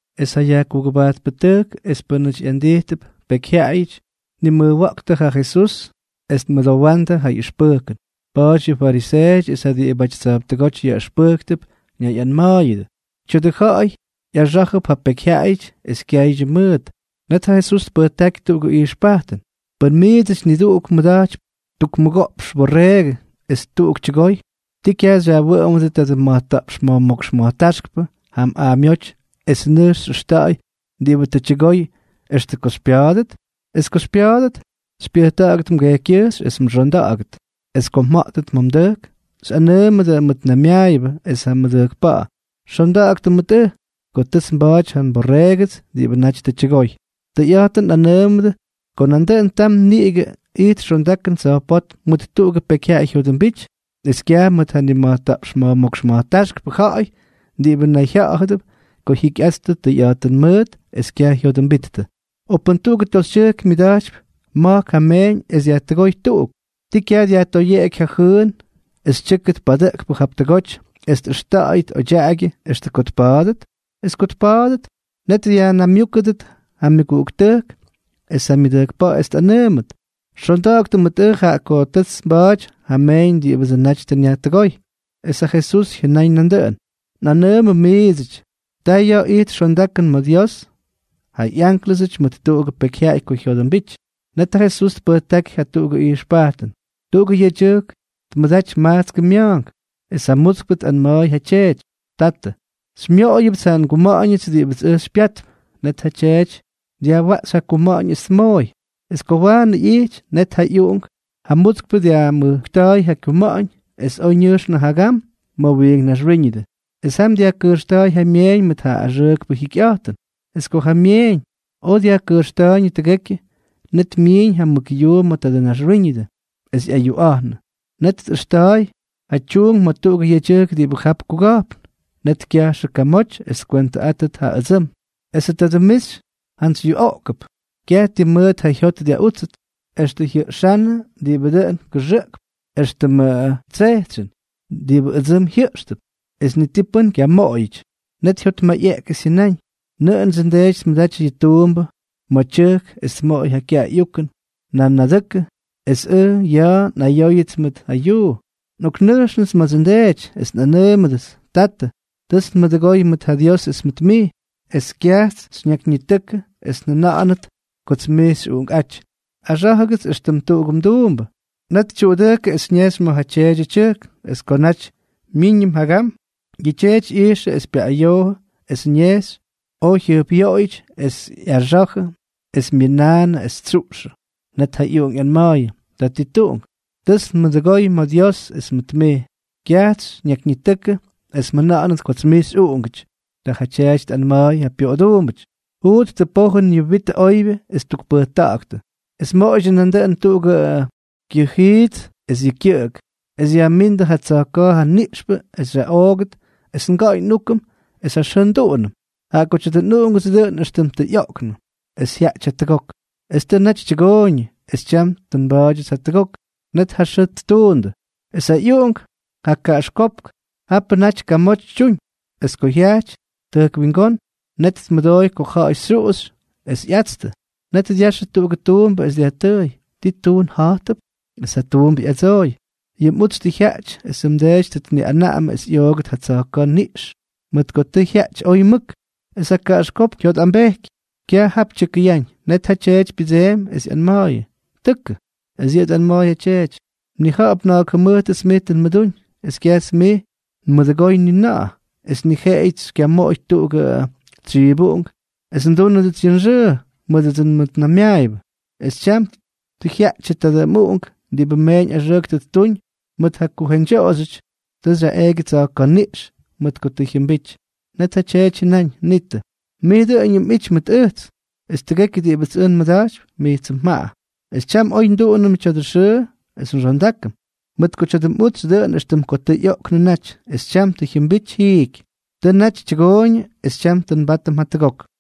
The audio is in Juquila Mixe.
Es ja yajkugʉbajtpʉtʉjk es pʉ́nʉty ꞌyandijtʉp pekyjyaꞌayʉty tnimʉjwa̱ꞌktʉ ja Jesús es tmʉdowa̱ꞌa̱ndʉ ja ꞌyʉxpʉjkʉn. Pa̱a̱ty yʉ fariseeʉty es ja diꞌibʉty tsa̱jptʉgóty yaꞌʉxpʉjktʉp ñayꞌanma̱a̱yʉdʉ: —Tya̱dʉ ja̱ꞌa̱y ꞌyaxá̱jʉp ja pekyjyaꞌayʉty es kyaydyʉ mʉʉt. Net ja Jesús tpʉjtáky tuꞌugʉ ijxpajtʉn: —Pʉn miidsʉty niduꞌuk mmʉda̱jtypy tuk mʉgoꞌpxʉ mborreegʉ es tuꞌuk tyʉgoy, ¿ti kyaj xyajwʉꞌʉmʉdʉ tadʉ ma̱jta̱ꞌpx ma̱jmókx ma̱jtáxkpʉ jam aamyóty es nʉjx xyꞌʉxta̱ꞌa̱y diꞌibʉ tʉ tyʉgoy extʉ ko xypya̱a̱dʉt? Es ko xypya̱a̱dʉt, xypyʉjta̱ꞌa̱gʉt mgejkykyʉjxy es mxonda̱ꞌa̱gʉt. Es ko mja̱ꞌtʉt ma̱ mdʉjk, xyꞌanʉʉmʉdʉ mmʉtnaymyaayʉbʉ es ja mmʉdʉjkpa̱ꞌa̱: “Xonda̱ꞌa̱ktʉ mʉt ʉj, ko tʉts nba̱a̱ty ja nborreegʉts diꞌibʉ naty tʉ tyʉgoy.” Tʉyꞌa̱jtʉn nꞌanʉʉmʉdʉ ko nandʉꞌʉn tam niꞌigʉ ijt xondakʉn tsa̱jpótm mʉt tuꞌugʉ pekyjyaꞌay jyodʉmbity es kyaj mʉt ja nima̱jta̱ꞌpx ma̱jmókx ma̱jtáxkpʉ ja̱ꞌa̱y diꞌibʉ nayjya̱ꞌa̱dʉp ko jyikyꞌattʉ tʉyꞌa̱jtʉn mʉʉt es kyaj jyodʉmbittʉ. ’O pʉn tuꞌugʉ toxytyʉjk myʉda̱jtypy ma̱jk ja meeñ es dyajtʉgóy tuꞌuk, ¿ti kyaj dyajtoyeꞌeky ja jyʉʉn es tyʉ́kʉt padʉꞌkpʉ jap tʉgoty es tꞌʉxta̱ꞌa̱yʉt odyaꞌagyʉ extʉ ko tpa̱a̱dʉt? Es ko tpa̱a̱dʉt, net dyajnaymyúkʉdʉt ja myʉguꞌuktʉjk es ja myʉdʉjkpa̱ꞌa̱, es tꞌanʉʉmʉt: “Xonda̱ꞌa̱ktʉ mʉt ʉj, jaꞌa ko tʉts nba̱a̱ty ja nmeeñ diꞌibʉdsʉ naty tʉ nyajtʉgóy.” Es ja Jesús jyʉnaꞌañ nandʉꞌʉn: —Nꞌanʉʉmʉ miidsʉty, ta yʉ ijt xondakʉn ma̱ Dios ja ꞌyánklʉsʉty mʉt tuꞌugʉ pekyjyaꞌay ko jyodʉmbity. Net ja Jesús tpʉjtáky jatuꞌugʉ ijxpajtʉn: —Tuꞌugʉ yedyʉjk tmʉda̱jty majtskʉ mya̱a̱nk. Es ja mutskpʉ tꞌanma̱a̱y ja tyeety: “Tatʉ, xymyoꞌoyʉpts ja nguma̱ꞌa̱ñʉts diꞌibʉts ʉj xypyatp.” Net ja tyeety dyajwaꞌxy ja kuma̱ꞌa̱ñ es tmooy. Es ko waanʉ ꞌyijty, net ja ꞌyuꞌunk ja mutskpʉ dyajmujkta̱a̱y ja kyuma̱ꞌa̱ñ, es oj ñʉjxnʉ jagam ma̱ wiink naxwíñʉdʉ. Es jam dyajkʉjxta̱a̱y ja myeeñ mʉt ja axʉʉkpʉ jyikyꞌa̱jtʉn. Es ko ja myeeñ oj dyajkʉjxta̱a̱yñʉ tʉgekyʉ, net myiiñ ja mʉk yuu ma̱ tadʉ naxwíñʉdʉ, es ꞌyayuꞌa̱jnʉ. Net tꞌʉxta̱a̱y ja tyuunk ma̱ tuꞌugʉ yedyʉjk diꞌibʉ jap kuga̱jpn. Net kyajxʉ kyamoty es tkwentʉꞌátʉt ja ʉdsʉm. Esʉ tadʉ mixy jantsy yuꞌoꞌkʉp. Kyaj ti mʉʉt ja jyot dyaꞌútsʉt, extʉ jyajʉꞌxánnʉ diꞌibʉ dʉꞌʉn kʉxʉꞌkp éxtʉmʉ tsejtsyʉn, diꞌibʉ ʉdsʉm jyʉꞌxtʉp, es ni ti pʉ́n kyamoꞌoyʉty. ’Net jyotmayꞌeꞌky es jyʉnáñ: “¡Nʉꞌʉndsʉ ndeety tmʉdaty yʉ tuumbʉ ma̱ tyʉjk es tmoꞌoy ja kyaꞌay ꞌyukʉn nanadʉkʉ es ʉj ja ya̱a̱ nꞌayóyʉts mʉt ja yuu! Nꞌoknʉjxnʉts ma̱dsʉ ndeety, es nꞌanʉʉmʉdʉts: Tatʉ, tʉts nduundʉgóy mʉt ja Dios es mʉt mij. Kyajts xyñakyñitʉkʉ es mjʉna̱ꞌa̱nʉt kots mij xyꞌuꞌungʉty. Axá̱jʉgʉts éxtʉm tuꞌugʉ mduumbʉ.” Net tyuꞌudʉjkʉ es ñejxy ma̱ ja tyeedyʉ tyʉjk. Es ko naty myíñʉm jagam, yʉ tyeety ꞌyijxʉ es pyaꞌꞌayoojʉ, es ñejxy oj jyʉjpꞌyoꞌoyʉty, es ꞌyaxa̱jʉ es myʉnaanʉ es tsyuꞌxʉ. ’Net ja ꞌyuꞌunk ꞌyanma̱a̱yʉ: “Tatituꞌunk, tʉts nduundʉgóy ma̱ Dios es mʉt mij. Kyajts xyñakyñitʉkʉ es mjʉna̱ꞌa̱nʉt kots mij xyꞌuꞌungʉty.” Ta ja tyeety tꞌanma̱a̱y ja pyoꞌoduumbʉty: “Juuttʉ pojʉn yʉ wit ja oybyʉ es tukpʉjta̱ꞌa̱ktʉ. Es moꞌoydyʉ nandʉꞌʉn tuꞌugʉ kyʉjiits es yʉ kyʉꞌʉk, es yajmíndʉ ja tsa̱jka̱a̱ ja niꞌxpʉ es xyaꞌoogʉt es nga̱ꞌa̱y nꞌúkʉm es ja xʉʉ nduꞌunʉm. Jaꞌa ko tya̱dʉ nꞌuꞌungʉts dʉꞌʉn éxtʉm tʉ ꞌyoꞌknʉ, es tʉ jyaꞌty jatʉgok. Es tʉ naty tyʉgooyñʉ, es tyam tʉ nba̱a̱dyʉts jatʉgok.” Net ja xʉʉ ttuundʉ. ’Es ja ꞌyuꞌunk ja kaꞌaxkópk japʉ naty kamoty tyuñ. Es ko jyajty tʉjk wingón, net tmʉdooy ko ja̱ꞌa̱y xyuꞌuxy es ꞌyatstʉ. Net dyaxʉ tuꞌugʉ tuumbʉ es dyajtʉʉy: “¿Ti tuun ja̱jtʉp?” Es ja tuumbʉ ꞌyadsooy: “Yʉ mꞌutsy tʉ jyaꞌty esʉ mdeety tʉ tniꞌanaꞌamʉ es ꞌyoogʉt ja tsa̱jka̱ niꞌx mʉt ko tʉ jyaꞌty oy mʉk.” Es ja kaꞌaxkópk jyotꞌambejky. Kyaj jap tyʉkʉyáñ. Net ja tyeety pyʉdseemy es ꞌyanma̱a̱yʉ: “Tʉkʉ.” Es yʉꞌʉ tꞌanma̱a̱y ja tyeety: “Mnija̱ꞌa̱p na̱a̱k jʉmʉjtʉts mij tʉ nmʉdúñ, es kyajts mij nmʉdʉgoy ni na̱ꞌa̱, es ni jeꞌeyʉts xykyamoꞌoy tuꞌugʉ tsyibuꞌunk es ndúnʉdʉts yʉ nxʉʉ mʉdʉdsʉ nmʉtnaymyaayʉbʉ. Es tyam tʉ jyaꞌtyʉ tadʉ mꞌuꞌunk diꞌibʉ mmeeñ axʉʉk tʉ ttuñ mʉt ja kujeñdyoꞌoxyʉty, es tʉ xyaꞌeeky yʉ tsa̱jka̱ niꞌx mʉt ko tʉ jyʉmbity.” ’Net ja tyeety jyʉnáñ: “Nitʉ, mij dʉꞌʉñʉm mꞌity mʉt ʉjts, es tʉgekyʉ diꞌibʉts ʉj nmʉda̱jtypy, mijtsʉ mjaꞌa. Es tyam oy nduꞌunʉm tya̱dʉ xʉʉ es nxondákʉm, mʉt ko tya̱dʉ mꞌutsy dʉꞌʉn éxtʉm ko tʉ ꞌyoꞌknʉ naty, es tyam tʉ jyʉmbity jiiky. Tʉ naty tyʉgooyñʉ, es tyam tʉ nbátʉm jatʉgok.”